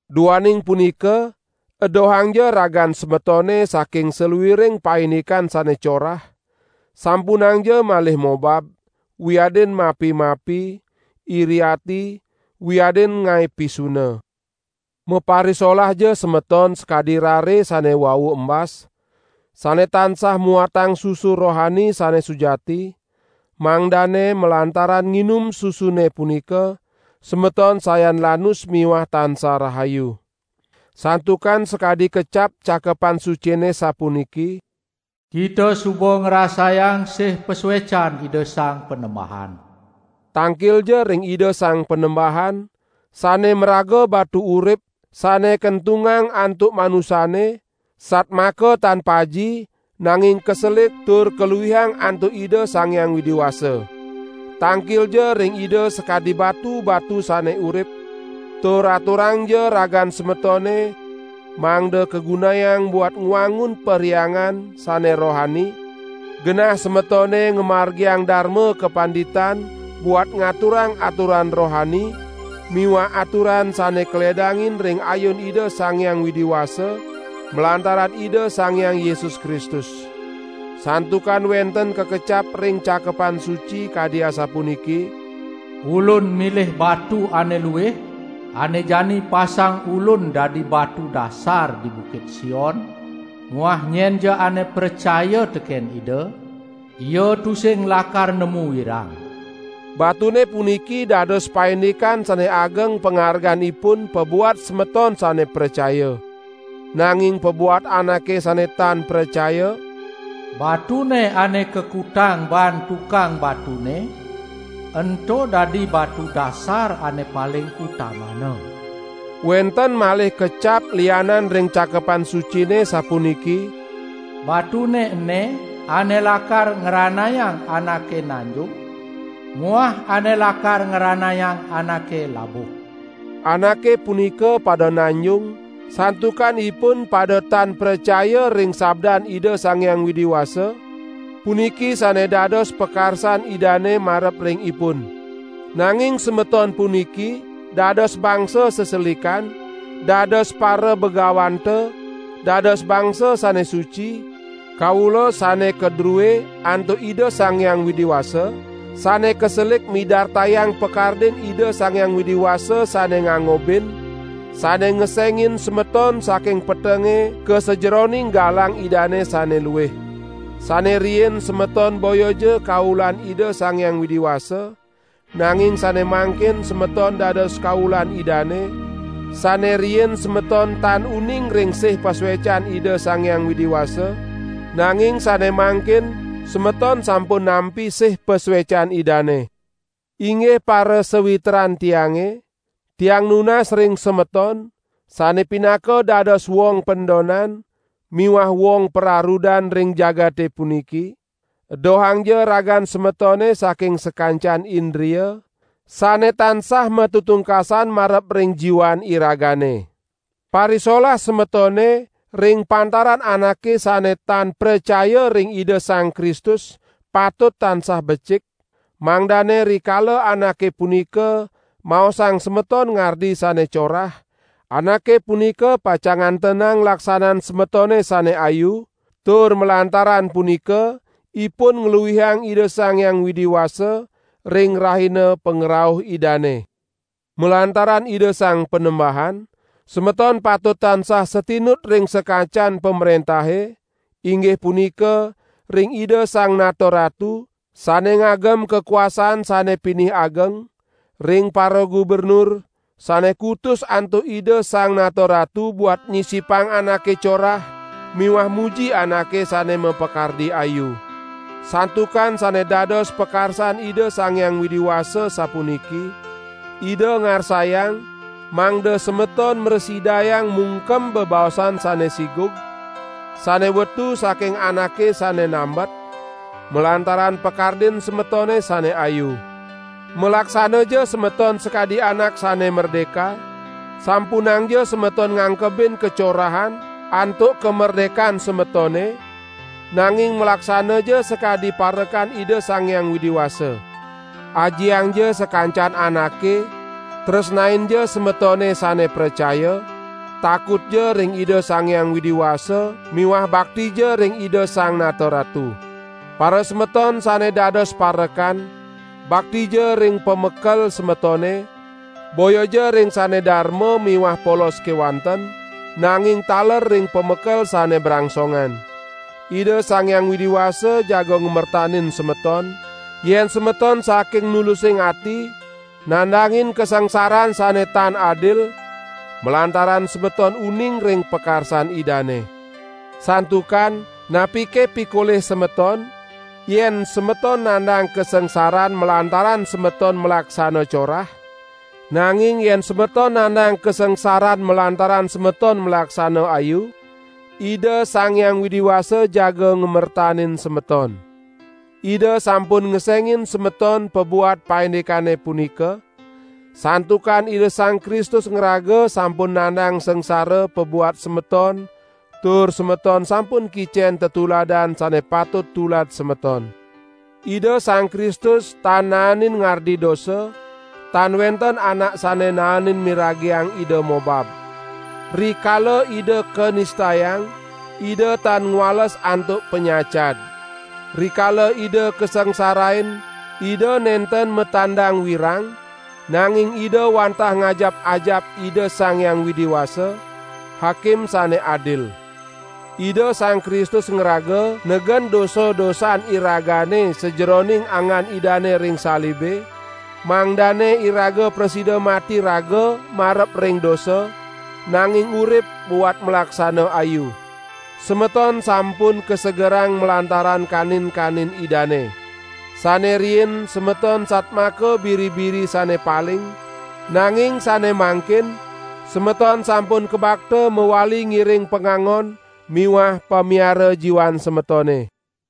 Duaning punika edohangja ragan semetone saking saluiring paindikan sane corah; sampunangja malih mobab, wiadin mapi-mapi, iri ati, wiadin ngae pisuna! Maparisolahja semeton sakadi rare sane wau embas, sane tansah muatang susu rohani sane sujati, mangdane malantaran nginum susune punika semeton sayan lanus miwah tansah rahayu. Santukan sakadi kecap Cakepan Sucine sapuniki: "Kita suba ngrasayang sih pasuecan Ida Sang Panembahan." Tangkilja ring Ida Sang Panembahan, sane maraga batu urip sane kentungang antuk manusane satmaka tan paji, nanging kaselik tur kaluihang antuk Ida Sang Hyang Widi Wasa. Tangkilja ring Ida sakadi batu-batu sane urip, tur aturangja ragan semetone mangda kagunayang buat ngwangun perhyangan sane rohani, genah semetone ngamargiang darma kapanditan buat ngaturang aturan rohani miwah aturan sane kaledangin ring ayun Ida Sang Hyang Widi Wasa, malantaran Ida Sang Hyang Yesus Kristus. Santukan wenten kakecap ring Cakepan Suci kadi asapuniki: "Ulun milih batu ane luih, ane jani pasang Ulun dadi batu dasar di Bukit Sion; muah nyenja ane pracaya teken Ida, ia tusing lakar nemu wirang." Batune puniki dados paindikan sane ageng pangarganipun pabuat semeton sane pracaya. Nanging pabuat anake sane tan pracaya: "Batune ane kakutang baan tukang batune ento dadi batu dasar ane paling utamana." Wenten malih kecap lianan ring Cakepan Sucine sapuniki: "Batune ene ane lakar ngranayang anake nanjung muah ane lakar ngranayang anake labuh." Anake punika pada nanjung santukan ipun pada tan pracaya ring Sabdan Ida Sang Hyang Widi Wasa; puniki sane dados pakarsan Idane marep ring ipun. Nanging semeton puniki dados bangsa seselikan, dados parabagawanta, dados bangsa sane suci, kaula sane kadrue antuk Ida Sang Hyang Widi Wasa, sane kaselik midartayang pakardin Ida Sang Hyang Widi Wasa sane ngangobin, sane ngesengin semeton saking petenge ka sajeroning galang Idane sane luih. Sane riin semeton boyaja kaulan Ida Sang Hyang Widi Wasa, nanging sane mangkin semeton dados kaulan Idane; sane riin semeton tan uning ring sih pasuecan Ida Sang Hyang Widi Wasa, nanging sane mangkin semeton sampun nampi sih pasuecan Idane. Inggih parasawitran tiange, tiang nunas ring semeton, sane pinaka dados wong pendonan miwah wong pararudan ring jagate puniki! Edohangja ragan semetone saking sakancan indria, sane tansah matetungkasan marep ring jiwan iragane. Parisolah semetone ring pantaran anake sane tan pracaya ring Ida Sang Kristus patut tansah becik, mangdane rikala anake punika maosang semeton ngardi sane corah, anake punika pacang ngantenang laksanan semetone sane ayu, tur malantaran punika ipun ngluihang Ida Sang Hyang Widi Wasa ring Rahina pangrauh Idane. Malantaran Ida Sang Panembahan, semeton patut tansah satinut ring sakancan pamrentahe, inggih punika: ring Ida Sang Nata Ratu, sane ngagem kakuasan sane pinih ageng, ring paragubernur, sane kutus antuk Ida Sang Nata Ratu buat nyisipang anake corah miwah muji anake sane mapakardi ayu. Santukan sane dados pakarsan Ida Sang Hyang Widi Wasa sapuniki: Ida ngarsayang mangda semeton mrasidayang mungkem bebaosan sane sigug, sane wetu saking anake sane nambet, malantaran pakardin semetone sane ayu. Malaksanaja semeton sakadi anak sane merdeka; sampunangja semeton ngangkebin kacorahan antuk kamerdekan semetone, nanging malaksanaja sakadi parekan Ida Sang Hyang Widi Wasa. Ajiangja sakancan anake, tresnainja semetone sane pracaya, takutja ring Ida Sang Hyang Widi Wasa miwah baktija ring Ida Sang Nata Ratu. Parasemeton sane dados parekan, baktija ring pamekel semetone, boyaja ring sane darma miwah polos kewanten, nanging taler ring pamekel sane brangsongan. Ida Sang Hyang Widi Wasa jaga ngamertanin semeton, yen semeton saking nulusing ati nandangin kasangsaran sane tan adil, malantaran semeton uning ring pakarsan Idane. Santukan, napike pikolih semeton, yen semeton nandang kasangsaran malantaran semeton malaksana corah? Nanging yen semeton nandang kasangsaran malantaran semeton malaksana ayu, Ida Sang Hyang Widi Wasa jaga ngamertanin semeton. Ida sampun ngesengin semeton pabuat paindikane punika, santukan Ida Sang Kristus ngraga sampun nandang sangsara pabuat semeton tur semeton sampun kicen tetuladan sane patut tulad semeton. Ida Sang Kristus tan naenin ngardi dosa, tan wenten anak sane naenin miragiang Ida mobab. Rikala Ida kanistayang, Ida tan ngwales antuk panyacad. Rikala Ida kasangsarain Ida nenten matandang wirang, nanging Ida wantah ngajap-ajap Ida Sang Hyang Widi Wasa, Hakim sane adil. Ida Sang Kristus ngraga negen dosa-dosan iragane sajeroning anggan Idane ring salibe, mangdane iraga prasida mati raga marep ring dosa, nanging urip buat malaksana ayu. Semeton sampun kasegerang malantaran kanin-kanin Idane. Sane riin semeton satmaka biri-biri sane paling, nanging sane mangkin semeton sampun kabakta mawali ngiring Pangangon miwah Pamiara jiwan semetone.